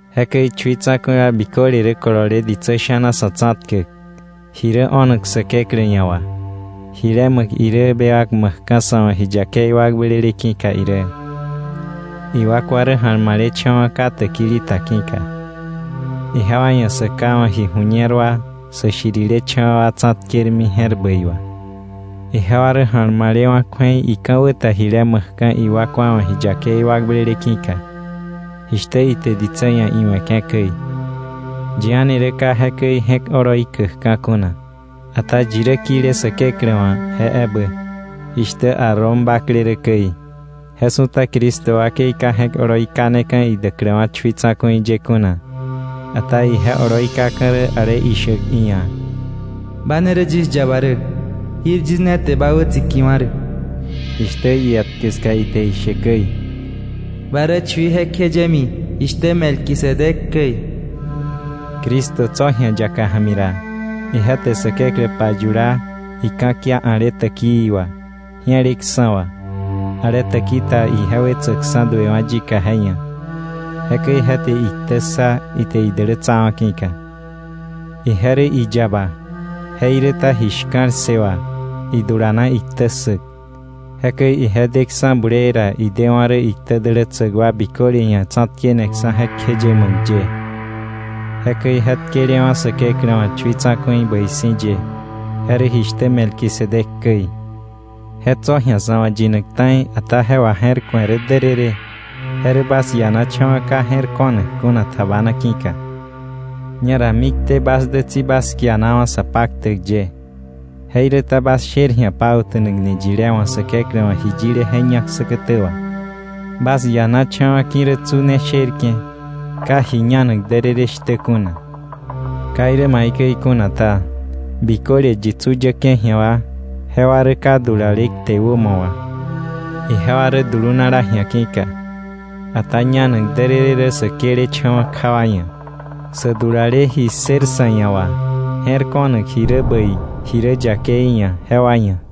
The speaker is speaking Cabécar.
Jekäi chui tsa̱ku̱i wa biköle rä kolole ditsä sha̱na sa̱ tsa̱tkäk, ji rä o̱nak Säkeklä ia̱ wà, jile ma̱k irä bewak ma̱kka̱ sa̱ wa̱ ji yakei wakblele ki̱ka irä. Iwakwa rä ja̱lmalecha̱wa̱ ka täkili ta ki̱ka, ijewa ia̱ sä ka wa̱ ji ju̱ñer wa, sä shirilecha̱wa̱ wa tsa̱tkermi je̱r bäi wà. Ijewa rä ja̱lmalewa̱ kju̱ei ika̱wä ta jile ma̱kka̱ iwakwa wa̱ ji yakei wakblele ki̱ka, jishtä ite ditsä ia̱ iwe̱ke̱ käi. Yi a̱ni rä ka jekäi je̱k oloi käkka̱ kuna, ata yi rä kile Säkeklä wa̱ je ebä, jishtä Aarón bakle rä käi. Je su̱ta Cristo wakei ka je̱k oloi kaneka̱ idäkläwa̱ chui tsa̱ku̱i ye kuna. Ata ije oloi käkka̱ rä ale ishäk iia̱: “Ba ne rä yis yaba rä, jir yis ne te ba wätsikiwa̱ rä.” Jishtä ietkä ska ite ishe käi: “Ba rä chui jekjeyemi, jishtä Melquisedec käi.” Cristo tso̱ ji̱a yaka ja̱mi ra, ije te Säkeklä payula, ika̱kia a̱le täkii wa, ji̱eleksa̱ wa, ale täki ta ije wetsäkksa̱ duewa̱ yika je ia̱. Jekäi je te iktä ssa ite idälätsawa̱ ki̱ka. Ije rä iyaba, jeiräta ji shka̱l ssë wà idulana iktä ssäk. Jekäi ije deksa̱ bulee ra, idewa̱ rä iktä dälätsäk wa biköle ia̱ tsa̱tkeneksa̱ jekjeye ma̱k ye. Jekäi je tkelewa̱ Säkeklä wa̱ chui tsa̱ku̱i bäi si̱ ye, je rä jishtä Melquisedec käi. Je tso̱ ji̱a sa̱ wa̱ yinak ta̱i, ata je waje̱rku̱e rä därërë, je rä bas ianacha̱wa̱ ka je̱r ko̱nak kuna tjabana ki̱ka. Ñera mikté bas dä tsi bas kianawa̱ sa paktäk ye, jeiräta bas sher ji̱a pauta̱nakni yilé wa̱ Säkeklä wa̱ ji yile je ñak säkätä wà. Bas ianacha̱wa̱ ki̱ rä tsu ne sherke̱, ka ji ñanak därërë shtä kuna. Ka irä maikäi kuna ta, biköle yi tsu yäke̱ ji̱a wa, jewa rä ka dulale kte wämo wà, ijewa rä dulunala ji̱a ki̱ka. Ata ñanak därërë rä sä këlecha̱wa̱ kja wa ia̱, sä dulale ji ssër sa̱ ia̱ wà je̱r ko̱nak ji rä bäi ji rä yakei ia̱ jewa ia̱.